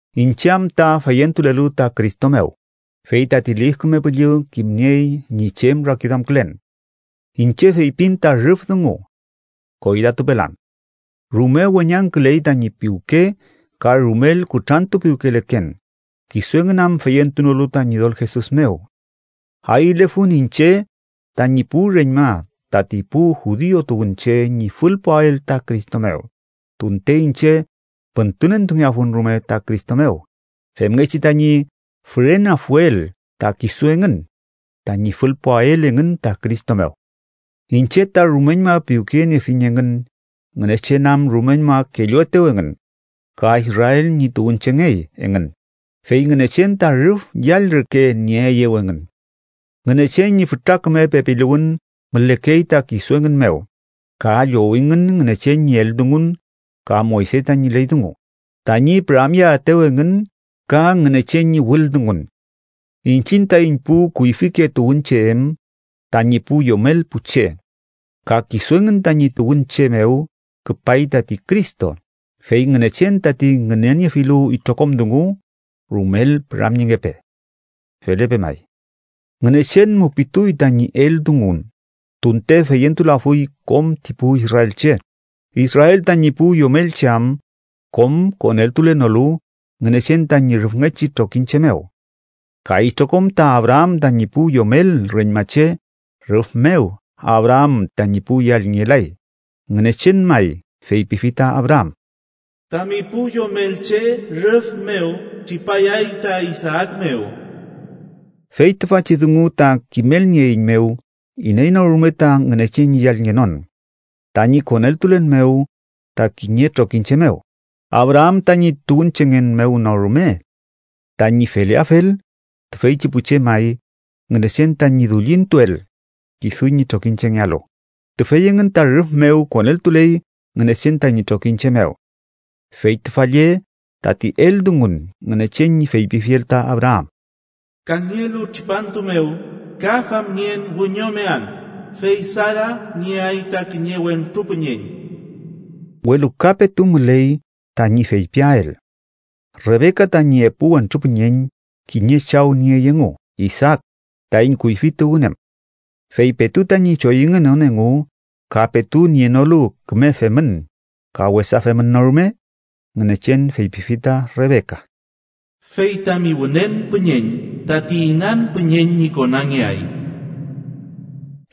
Iñche am ta feyentulelu ta Cristo mew, fey tati Lif Küme Püllü kimniey ñi chem rakiduamkülen. Iñche feypin ta rüf dungu. Koylatupelan. Rume weñangküley tañi piwke ka rumel kutrantupiwkeleken, kisu engün am feyentunolu ta Ñidol Jesus mew. Ayülefun iñche tañi pu reñma tati pu judiu tuwünche ñi fülpuael ta Cristo mew, tunte iñche püntünentungeafun rume ta Cristo mew femngechi tañi füreneafuel ta kisu engün tañi fülpuael engün ta Cristo mew. Iñche ta rumeñma piwkeyeniefiñ engün Ngünechen am rumeñma kelluetew engün ka Israel ñi tuwünchengey engün, fey Ngünechen ta rüf yall reke nieeyew engün. Ngünechen ñi fütra küme pepiluwün mülekey ta kisu engün mew, ka llowingün Ngünechen ñi eldungun ka Moyse tañi ley dungu, tañi püramyeaetew engün ka Ngünechen ñi wüldungun. Iñchiñ taiñ pu kuyfike tuwünche em tañi pu yomel pu che. Ka kisu engün tañi tuwünche mew küpay tati Cristo, fey Ngünechen tati ngüneniefilu itrokom dungu. Rumel püramyengepe. Felepe may. Ngünechen mupituy tañi eldungun tunte feyentulafuy kom ti pu israelche, Israel tañi pu yomelche am kom koneltulenolu Ngünechen tañi rüfngechi trokiñche mew. Ka itrokom ta Abraam tañi pu yomel reñmache rüf mew Abraam tañi pu yallngelay, Ngünechen may feypifi ta Abraam: “Tami pu yomelche rüf mew tripayay ta Isaak mew.” Fey tüfachi dungu ta kimelnieeiñmew iney no rume ta Ngünechen ñi yallngenon tañi koneltulen mew ta kiñe trokiñche mew, Abraam tañi tuwünchengen mew no rume. Tañi feleafel, tüfeychi pu che may Ngünechen tañi dullintuel kisu ñi trokiñchengealu, tüfey engün ta rüf mew koneltuley Ngünechen tañi trokiñche mew. Fey tüfa lle tati eldungun Ngünechen ñi feypifiel ta Abraam: “Kangelu tripantu mew ka famngen wiñomean, fey Sara nieay ta kiñe wentru püñeñ.” Welu ka petu müley tañi feypiael. Rebeka tañi epu wentru püñeñ kiñe chaw niey engu Isaak, taiñ kuyfi tuwün em. Fey petu tañi choyüngenon engu, ka petu nienolu küme femün ka wesa femün no rume, Ngünechen feypifi ta Rebeka: “Fey tami wünen püñeñ tati inan püñeñ ñi konangeay.”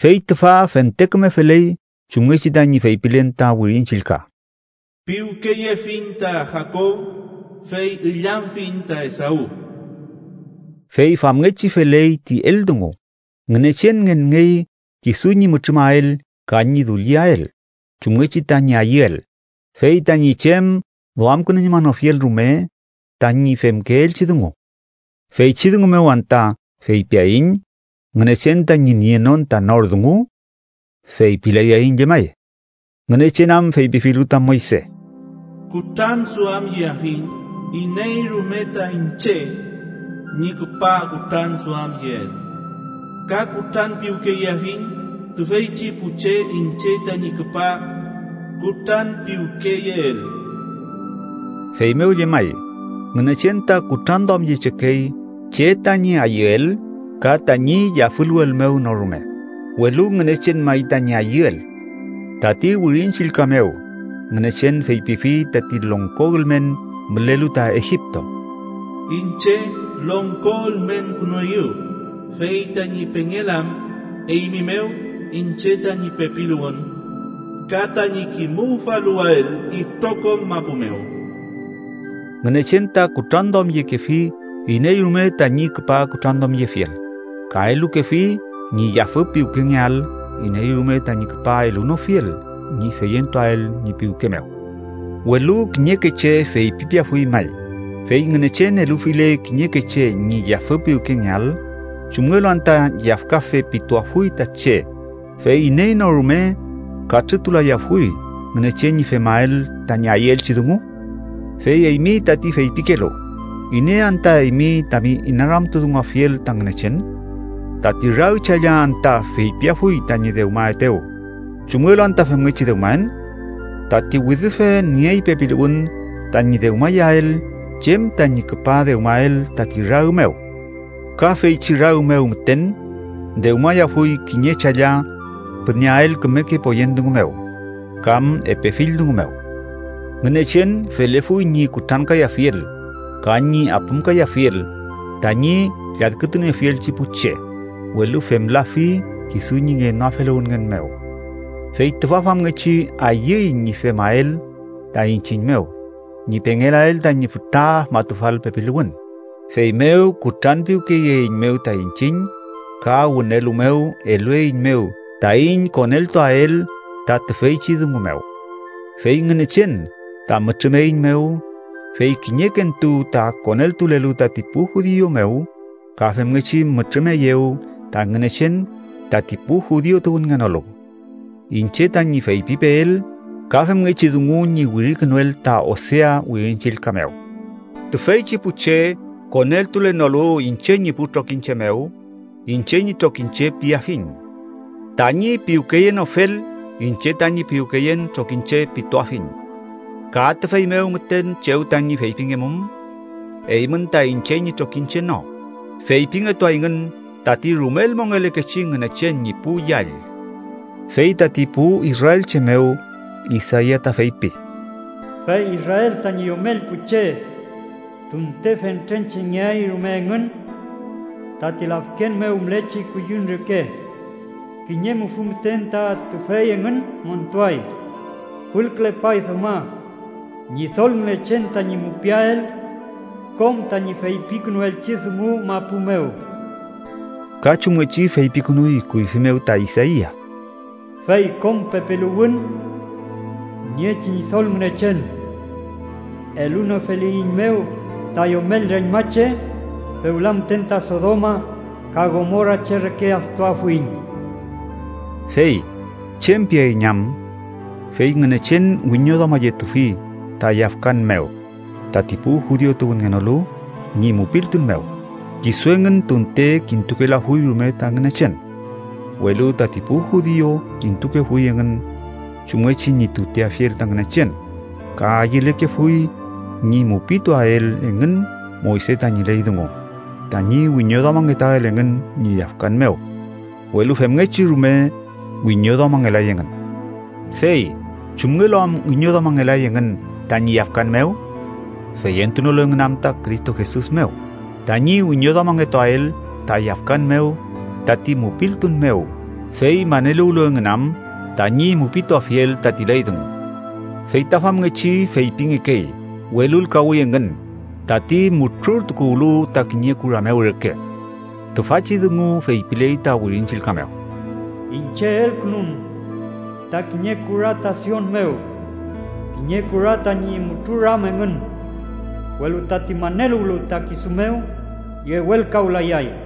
Fey tüfa fente küme feley chumngechi tañi feypilen ta Wirin Chillka: “Piwkeyefiñ ta Jakob, fey illamfiñ ta Esaw.” Fey famngechi feley ti eldungu, Ngünechen ngenngey kisu ñi mütrümael ka ñi dulliael, chumngechi tañi ayüel, fey tañi chem duamkünuñmanofiel rume tañi femkeelchi dungu. ¿Feychi dungu mew anta feypiaiñ Ngünechen tañi nienon ta nor dungu? ¡Feypilayaiñ llemay! Ngünechen am feypifilu ta Moyse: “Kutranduamyeafiñ iney rume ta iñche ñi küpa kutranduamyeel, ka kutranpiwkeyeafiñ tüfeychi pu che iñche tañi küpa kutranpiwkeyeel.” Feymew llemay, Ngünechen ta kutranduamyechekey che tañi ayüel ka tañi yafüluwel mew no rume, welu Ngünechen may tañi ayüel. Tati Wirin Chillka mew Ngünechen feypifi tati longko ülmen mülelu ta Egipto: “Iñche longko ülmenkünueyu, fey tañi pengelam, eymi mew, iñche tañi pepiluwün ka tañi kimuwfaluwael itrokom mapu mew.” Ngünechen ta kutranduamyekefi iney rume tañi küpa kutranduamyefiel, ka elukefi ñi yafü piwkengeael iney rume tañi küpa elunofiel ñi feyentuael ñi piwke mew. Welu kiñeke che feypipeafuy may, “fey Ngünechen elufile kiñeke che ñi yafü piwkengeael, ¿chumngelu anta yafkafe pituafuy ta che, fey iney no rume katrütulayafuy Ngünechen ñi femael tañi ayüelchi dungu?” Fey eymi tati feypikelu, ¿iney anta eymi tami inaramtudunguafiel ta Ngünechen? ¿Tati rag challa anta feypiafuy tañi dewmaetew: “chumngelu anta femngechi dewmaen?” Tati widüfe niey pepiluwün tañi dewmayael chem tañi küpa dewmael tati rag mew, ka feychi rag mew müten dewmayafuy kiñe challa püneael kümeke poyen dungu mew kam epe fill dungu mew. Ngünechen felefuy ñi kutrankayafiel ka ñi apümkayafiel tañi lladkütuniefielchi pu che, welu femlafi kisu ñi ngenoafeluwünngen mew. Fey tüfa famngechi ayüy ñi femael ta iñchiñ mew ñi pengelael tañi fütra afmatufal pepiluwün, feymew kutranpiwkeyeeiñmew ta iñchiñ ka wünelu mew elueiñmew taiñ koneltuael ta tüfeychi dungu mew. Fey Ngünechen ta mütrümeiñmew, fey kiñekentu ta koneltulelu tati pu judiu mew ka femngechi mütrümeyew ta Ngünechen tati pu judiu tuwünngenolu. Iñche tañi feypipeel, ka femngechi dungu ñi wirikünuel ta Osea Wirin Chillka mew: “Tüfeychi pu che koneltulenolu iñche ñi pu trokiñche mew, ‘iñche ñi trokiñche’ piafiñ; tañi piwkeyenofel, ‘iñche tañi piwkeyen trokiñche’ pituafiñ.” “Ka tüfey mew müten chew tañi feypingemum: ‘Eymün ta iñche ñi trokiñche no’, feypingetuayngün tati rumel mongelekechi Ngünechen ñi pu yall.” Fey tati pu israelche mew, Isaia ta feypi: “Fey Israel tañi yomel pu che, tunte fentrenchengeay rume engün tati lafken mew mülechi kuyüm reke, kiñe mufü müten ta tüfey engün montuay. Fülkülepay dewma Ñidol Ngünechen tañi mupiael kom tañi feypikünuelchi dungu mapu mew.” Ka chumngechi feypikünuy kuyfi mew ta Isaia: “Fey kom pepiluwün niechi Ñidol Ngünechen elunofeliyiñmew ta yomel reñmache, fewla müten ta Sodoma ka Gomora che reke aftuafuiñ.” Fey ¿chem piaiñ am? Fey Ngünechen wiñoduamayetufi ta yafkan mew tati pu judiu tuwünngenolu ñi mupiltun mew, kisu engün tunte kintukelafuy rume ta Ngünechen. Welu tati pu judiu kintukefuy engün chumngechi ñi tuteafiel ta Ngünechen ka ayülekefuy ñi mupituael engün Moyse tañi ley dungu tañi wiñoduamangetuael engün ñi yafkan mew, welu femngechi rume wiñoduamangelay engün. Fey ¿chumngelu am wiñoduamangelay engün tañi yafkan mew? Feyentunolu engün am ta Cristo Jesus mew tañi wiñoduamangetuael ta yafkan mew tati mupiltun mew, fey maneluwlu engün am tañi mupituafiel tati ley dungu. Feyta famngechi feypingekey welulkawi engün tati mutrurtukuwlu ta kiñe kura mew reke. Tüfachi dungu feypiley ta Wirin Chillka mew: “Iñche elkünun ta kiñe kura ta Sion mew, kiñe kura tañi mutruram engün, welu tati maneluwlu ta kisu mew, yewelkawlayay.”